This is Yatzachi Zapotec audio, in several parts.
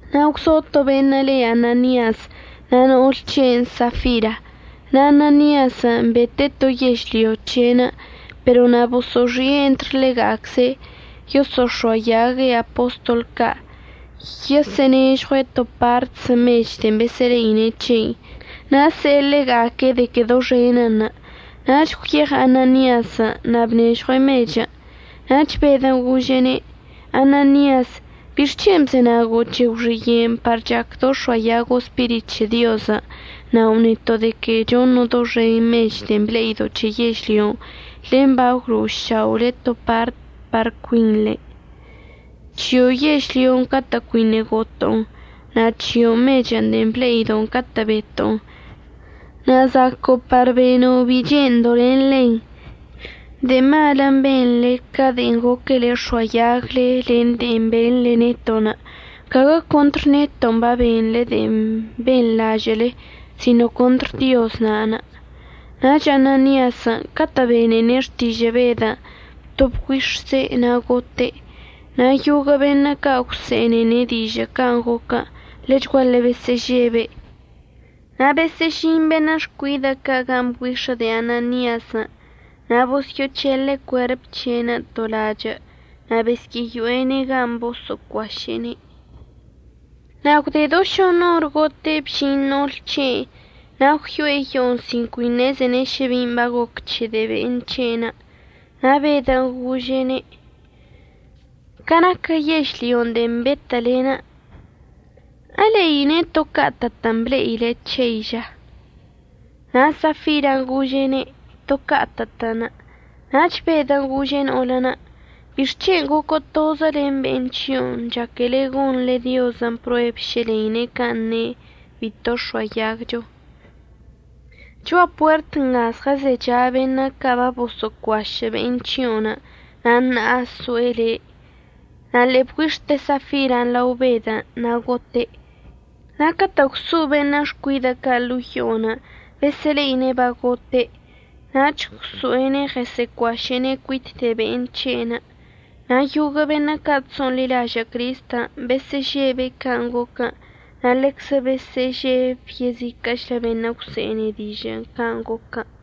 Na' zo to beṉə' le Ananias na' no'ol c̱he'enə' Safira, na' Ananiasən' bete'e to yežlyo c̱he'enə'. Pero na' boso'oxi'e entr ḻega'acze' yoso'ox̱oayague' apostol ca' yoo'onežɉue' to partzə mech de'en besə'əle'ine' c̱heinə' na' se'e ḻega'aque' de que doxenənṉə'. Nach gwyeɉ Ananiasən' na' bnežɉue' mechən'. Nach Bedən' gože'ene': ―Ananias, ¿bixc̱hen' bzenago' c̱he gwxiye'enə' par chacdo' əx̱oayago' Spirit c̱he Diozən', nao' neto' de que choṉo' doxen mechən' de'en ble'ido' c̱he yežlyon' len bagwlo'oša'ole to partən' par cuinḻen'? C̱hio' yežlyon' catə' cuiṉə' goto'on, na' c̱hio' mechən' de'en ble'ido' catə' beto'on na' zaco'o par beno' bi che'endo' len ḻen. De'e malən' benḻe ca de'en goquele əx̱oayagle len de'en beṉle neto'. Caguə contr neto'onə' babenḻe de'en benḻažə'əle sino contr Dioz na'anə'. Nach Ananiasən' catə' benene' xtižə' Bedən' to bgüix̱ze' na' gote'. Na' yoguə' beṉə' ca' gwse'enene' dižə' can' goquən' ḻechguaḻe besə'əžebe'. Na' besə'əžin beṉə' xcuidə' ca' gan' bgüix̱ə de'e Ananiasən' na' bosyə'əc̱hele' cuerp c̱he'enə' to lachə' na' besyə'əyo'ene' gan' boso'ocuaše'ene'. Na' gwde do šoṉ or gote' bžin no'ol c̱he'enə' na' gwyo'e yo'onə' sin cui ṉezene' šə bin' bagoc c̱he de'e be'en c̱he'enə'. Na' Bedən' gože'ene': ―Ca naquə yežlyon' de'en betə'əlen' ¿əḻeine' to ca'atə'ətən' ble'ile c̱hein' ža? Na' Safiran' gože'ene': ―To ca'atə'ətən'. Nach Bedən' gože' no'olən': ―¿Bixc̱hen' goco' tozə len be'en c̱hio'onə' chaquele gonḻe Diozən' prueb šə ḻeine' can' ne' bito əx̱oayagcho? Cho'a puert nga zɉəzecha beṉə' ca' baboso'ocuašə' be'en c̱hio'onə' na' ṉa'a so'e le'. Na' ḻe'e bgüix̱te Safiran' lao Bedən' na' gote'. Na' catə' gwso'o beṉə' xcuidə' ca' ḻo'o yo'onə' besə'əle'ine' bagote' nach gwso'ene' ɉəsə'əcuaše'ene' cuit de'e be'en c̱he'enə'. Na' yoguə' beṉə' ca' chso'onḻilažə' Cristən' besə'əžebe' can' goquən' na' ḻeczə besə'əžeb yeziquə'əchlə beṉə' gwse'ene dižə' can' goquən'.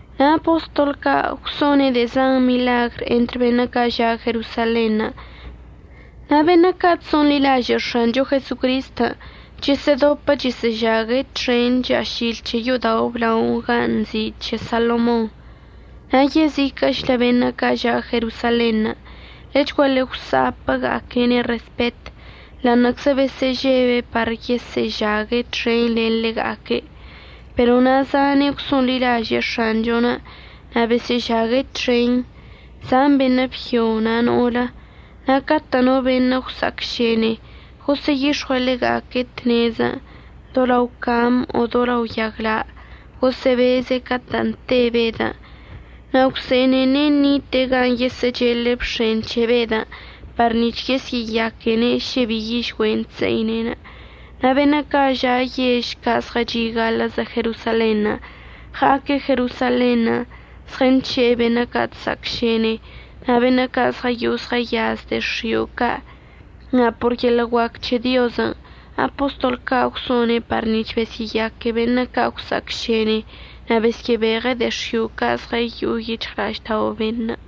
Na' apostol ca' gwso'one' de'e zan miḻagr entr beṉə' ca' ža' Jerosalenṉə'. Na' beṉə' ca' chso'onḻilažə' X̱ancho Jesocristən' chəsə'ədopə chəsə'əžague' txen cha'ašil c̱he yo'odao' əblaonə' gan' nzi' “C̱he Salomonṉə'”. Na' yeziquə'əchlə beṉə' ca' ža' Jerosalenṉə' ḻechguaḻe gwsa'apəga'aque'ene' respet, ḻa'aṉə'əczə besə'əžebe' par yesə'əžague' txen len ḻega'aque'. Pero na' zane' gwso'onḻilaže'e X̱anchon' na' besə'əžague' txen, zan beṉə' byo na' no'olə. Na' catə' no beṉə' gwsa'acšene gosə'əyix̱ɉue' ḻega'aque' tnezən' do lao cam o do lao yagla' gosə'əbeze' catə' te Bedən' na' gwse'enene' ṉite'e gan' yesə'əchele' bx̱en c̱he Bedən' par nic̱h yesyə'əyaquene' šə bi yižgüen' chse'ine'. Na' beṉə' ca' ža' yež ca' zɉəchi' gaḻə'əzə Jerosalenṉə' ɉa'aque' Jerosalenṉə' zɉənc̱he'e beṉə' ca' cha'acšene na' beṉə' ca' zɉəyo'o zɉəyaz de'e x̱io' ca'. Na' por yeḻə' guac c̱he Diozən' apostol ca' gwso'one' par nic̱h besyə'əyaque beṉə' ca' gwsa'acšene na' besyə'əbeɉe' de'e x̱io' ca' zɉəyo'o yic̱hɉla'aždao' beṉə'.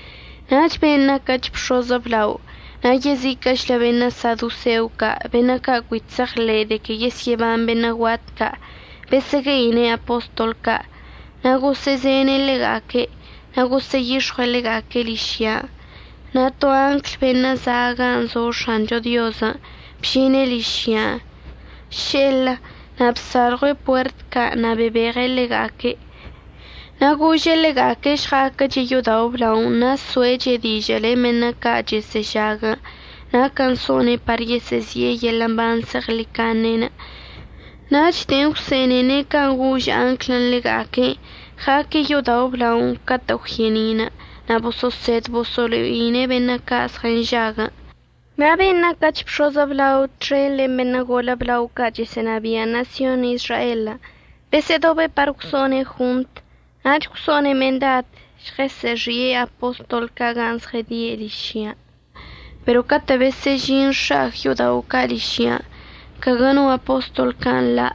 Nach ben' naquəch bx̱oz əblao na' yeziquə'əchlə beṉə' sadoseo ca' beṉə' ca' cui chse'eɉḻe'e de que yesyə'əban beṉə' guat ca', besə'əgue'ine' apostol ca'. Na' gosə'əzene' ḻega'aque' na' gosə'əyix̱ɉue' ḻega'aque' ližyan'. Na' to angl beṉə' za' gan' zo X̱ancho Diozən' bžine' ližyan' še'elə na' bsalɉue' puert ca' na' bebeɉe' ḻega'aque'. Na' gože' ḻega'aque' žɉa'aquəche' yo'odao' əblaonə' na' so'eche' dižə' len beṉə' ca' chəsə'əžaguən' naquən' so'one' par yesə'əzi'e yeḻə' mban zeɉḻicaṉen'. Nach de'en gwse'enene' can' gož anglən' ḻega'aque', ɉa'aque' yo'odao' əblaonə' catə' gwye'eni'inə' na' boso'osed boso'olo'ine' beṉə' ca' zɉənžaguən'. Na' ben' naquəch bx̱oz əblao txen len beṉə' golə blao ca' chəsə'ənabia' ṉasyon Izraelən' besə'ədobe' par gwso'one' jontən' nach gwso'one' mendad žɉəsə'əxi'e apostol ca' gan' zɉədie' ližyan'. Pero catə' besə'əžin x̱a'ag yo'odao' ca' ližyan' caguə no apostol ca' nḻa'.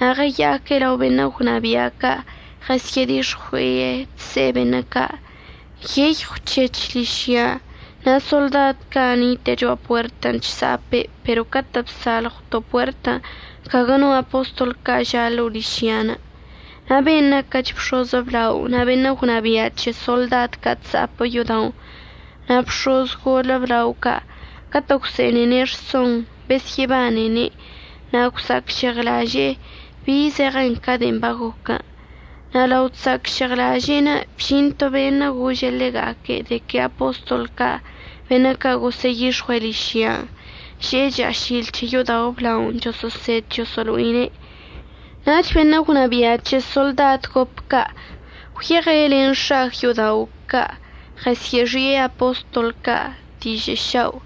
Na' ɉəya'aque' lao beṉə' gwnabia' ca' ɉəsyə'ədix̱ɉui'e. Chse'e beṉə' ca': ―Nyeyɉw c̱hec̱h ližyan' na' soḻdad ca' nite'e cho'a puertən' chsa'ape'en pero catə' bsalɉwto' puertən' caguə no apostol ca' ža' ḻo'o ližyan'. Na' ben' naquəch bx̱oz əblao na' beṉə' gwnabia' c̱he soḻdad ca' chsa'apə yo'oda'onə', na' bx̱oz golə blao ca' catə' gwse'enene' rsonṉə' besyə'əbanene' na' gwsa'acžeɉlaze'e bi zeɉe ca de'en bagoquən'. Na' lao chsa'acžeɉlaže'enə' bžin to beṉə' gože' ḻega'aque' de que apostol ca' beṉə' ca' gosə'əyix̱ɉue' ližyan' že'e cha'ašil c̱he yo'odao' əblaonə' choso'osed choso'olo'ine'. Nach beṉə' gwnabia' c̱he soḻdad gop ca' gwyeɉe' len x̱a'ag yo'odao' ca' ɉəsyə'əxi'e apostol ca' dižə' šao'.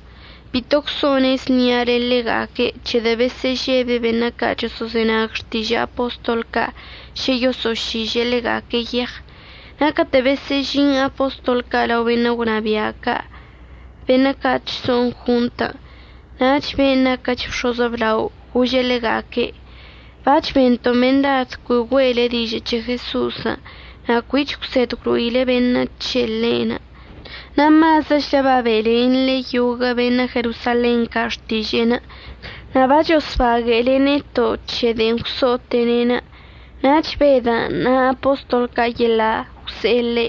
Bito gwso'one' znia len ḻega'aque' c̱hedə' besə'əžebe' beṉə' ca' choso'ozenag xtižə' apostol ca' šə yoso'ošiže'e ḻega'aque' yeɉ. Na' catə' besə'əžin apostol ca' lao beṉə' gwnabia' ca' beṉə' ca' chso'on jontən' nach ben' naquəch bx̱oz əblao gože' ḻega'aque': ―Bac̱h bento' mendad cui güe'ele dižə' c̱he Jeso'osən' na' cuich əgwsed əgwlo'ile beṉə' c̱he ḻe'enə', na' mazəchlə babe'elenḻe yoguə' beṉə' Jerosalen ca' xtiže'enə'. Na' bachosbaguə'əle neto' c̱he de'en gwso'ote'ene'. Nach Bedən' na' apostol ca' yeḻa' gwse'e ḻe':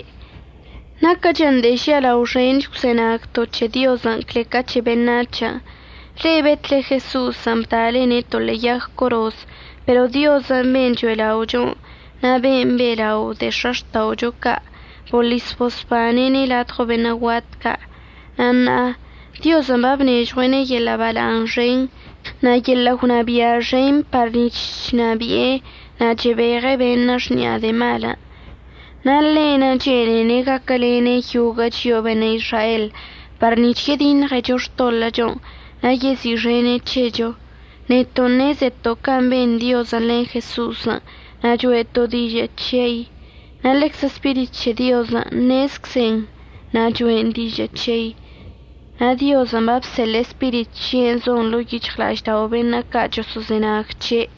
―Naquəchən de'e žialao xench gwzenagto' c̱he Diozən' cle ca c̱he beṉac̱hən'. Le'e betle Jeso'osən' bda'alene' to ḻe'e yag coroz pero Dioz ben' cho'ela'ocho na' ben' be'elao' de'e x̱axta'ocho ca' boḻis bosbane'ene' ladɉo beṉə' guat ca'. Na' ṉa'a Diozən' babnežɉue'ene' yeḻə' bala'aṉ xen na' yeḻə' gwnabia' xen par nic̱h chnabi'e na' chebeɉe' beṉə' xni'a de'e malən'. Na' ḻe'enə' chene'ene' gaquəlene' yoguə' chio'o beṉə' Izrael par nic̱h yediṉɉecho xtoḻə'əchon' na' yezi'ixene' c̱hecho. Neto' ṉezeto' can' ben Diozən' len Jeso'osən' na' cho'eto' dižə' c̱hei, na' ḻeczə Spirit c̱he Diozən' ṉezczen na' cho'en dižə' c̱hei na' Diozən' babseḻe'e Spirit c̱he'enə' zon ḻo'o yic̱hɉla'aždao' beṉə' ca' choso'ozenag c̱he'.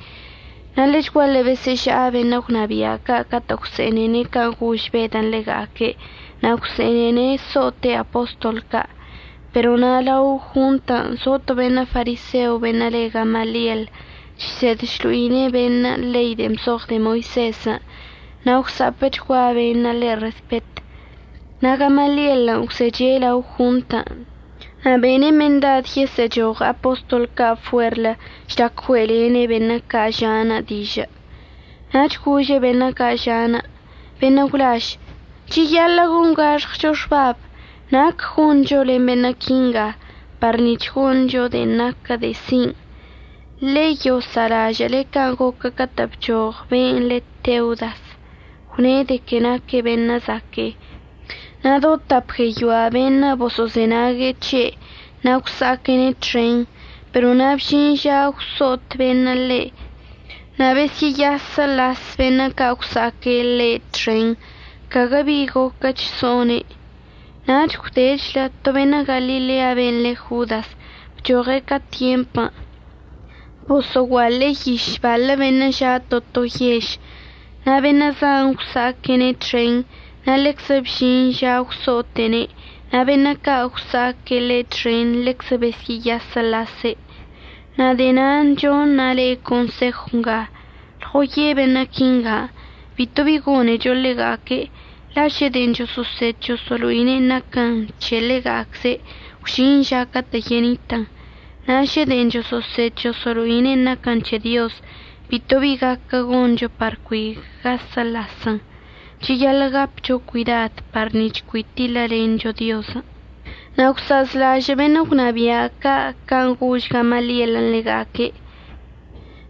Na' ḻechguaḻe besə'əža'a beṉə' gwnabia' ca' catə' gwse'enene' can' gož Bedən' ḻega'aque' na' gwse'enene' so'ote' apostol ca'. Pero na' lao jontən' zo to beṉə' fariseo beṉə' le Gamaliel. Chsed chlo'ine' beṉə' ḻei de'en bzoɉ de'e Moisezən' na' gwsa'apəchgua beṉə' ḻe' respet. Na' Gamalielən' gwzeche' lao jontən' na' bene' mendad yesə'əchoɉ apostol ca' fuerlə žlac güe'elene' beṉə' ca' ža'anə' dižə'. Nach gože' beṉə' ca' ža'anə': ―Beṉə' gwlaž, cheyaḻə' gongaxɉcho xbab nac goncho len beṉə' quinga par nic̱h goncho de'en naquə de'e sin'. Ḻe'e yosa'alažə' can' goquə catə' bchoɉ ben' le Teudas gwne' de que naque' beṉə' zaque'e. Na' do tap gueyoa beṉə' boso'ozenag c̱he' na' gwsa'aquene' txen. Pero na' bžin ža gwso'ot beṉə' ḻe' na' besyə'əyasəlas beṉə' ca' gwsa'aque' ḻe' txen, caguə bi goquəch so'one'. Nach gwdechlə to beṉə' Galilea ben' le Jodas bchoɉe' ca tyempən' boso'oguaḻe'e yiš baḻə beṉə' ža' to to yež, na' beṉə' zan gwsa'aquene' txen na' ḻeczə bžin ža gwso'ote'ene' na' beṉə' ca' gwsa'aque' ḻe' txen ḻeczə besyə'əyasəlase'. Na' de'e na'anə' choṉa' le'e consejw nga, lɉoye' beṉə' quinga, bito bi gonecho ḻega'aque'. La' šə de'en choso'osed choso'olo'ine'enə' naquən c̱he ḻega'acze' gwžin ža catə' yenitən. Na' šə de'en choso'osed choso'olo'ine'enə' naquən c̱he Diozən', bito bi gaquə goncho par cui gasəḻasən. Cheyaḻə' gapcho cuidad par nic̱h cui tiḻəlencho Diozən'. Na' gwsa'azlažə' beṉə' gwnabia' ca' can' gož Gamalielən' ḻega'aque'.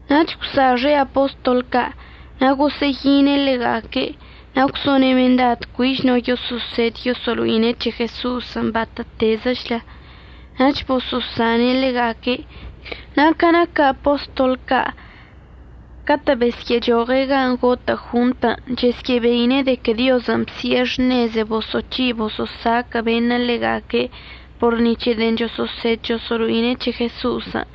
Nach gwsa'axe' apostol ca' na' gosə'əyine' ḻega'aque' na' gwso'one' mendad cuich no yoso'osed yoso'olo'ine' c̱he Jeso'osən' batə'ətezəchlə. Nach boso'osane' ḻega'aque'. Na' ca naquə apostol ca' catə' besyə'əchoɉe' gan' gotə' jontən' chesyə'əbeine' de que Diozən' bsi'e xṉeze boso'oc̱hi' boso'osaquə' beṉə' ḻega'aque' por ni c̱he de'en choso'osed choso'olo'ine' c̱he Jeso'osən'.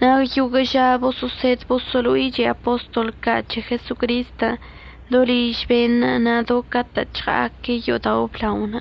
Na' yoguə' ža boso'osed boso'olo'iche apostol ca' c̱he Jesocristən' do liž beṉə' na' do catə' chɉa'aque' yo'odao' əblaonə'.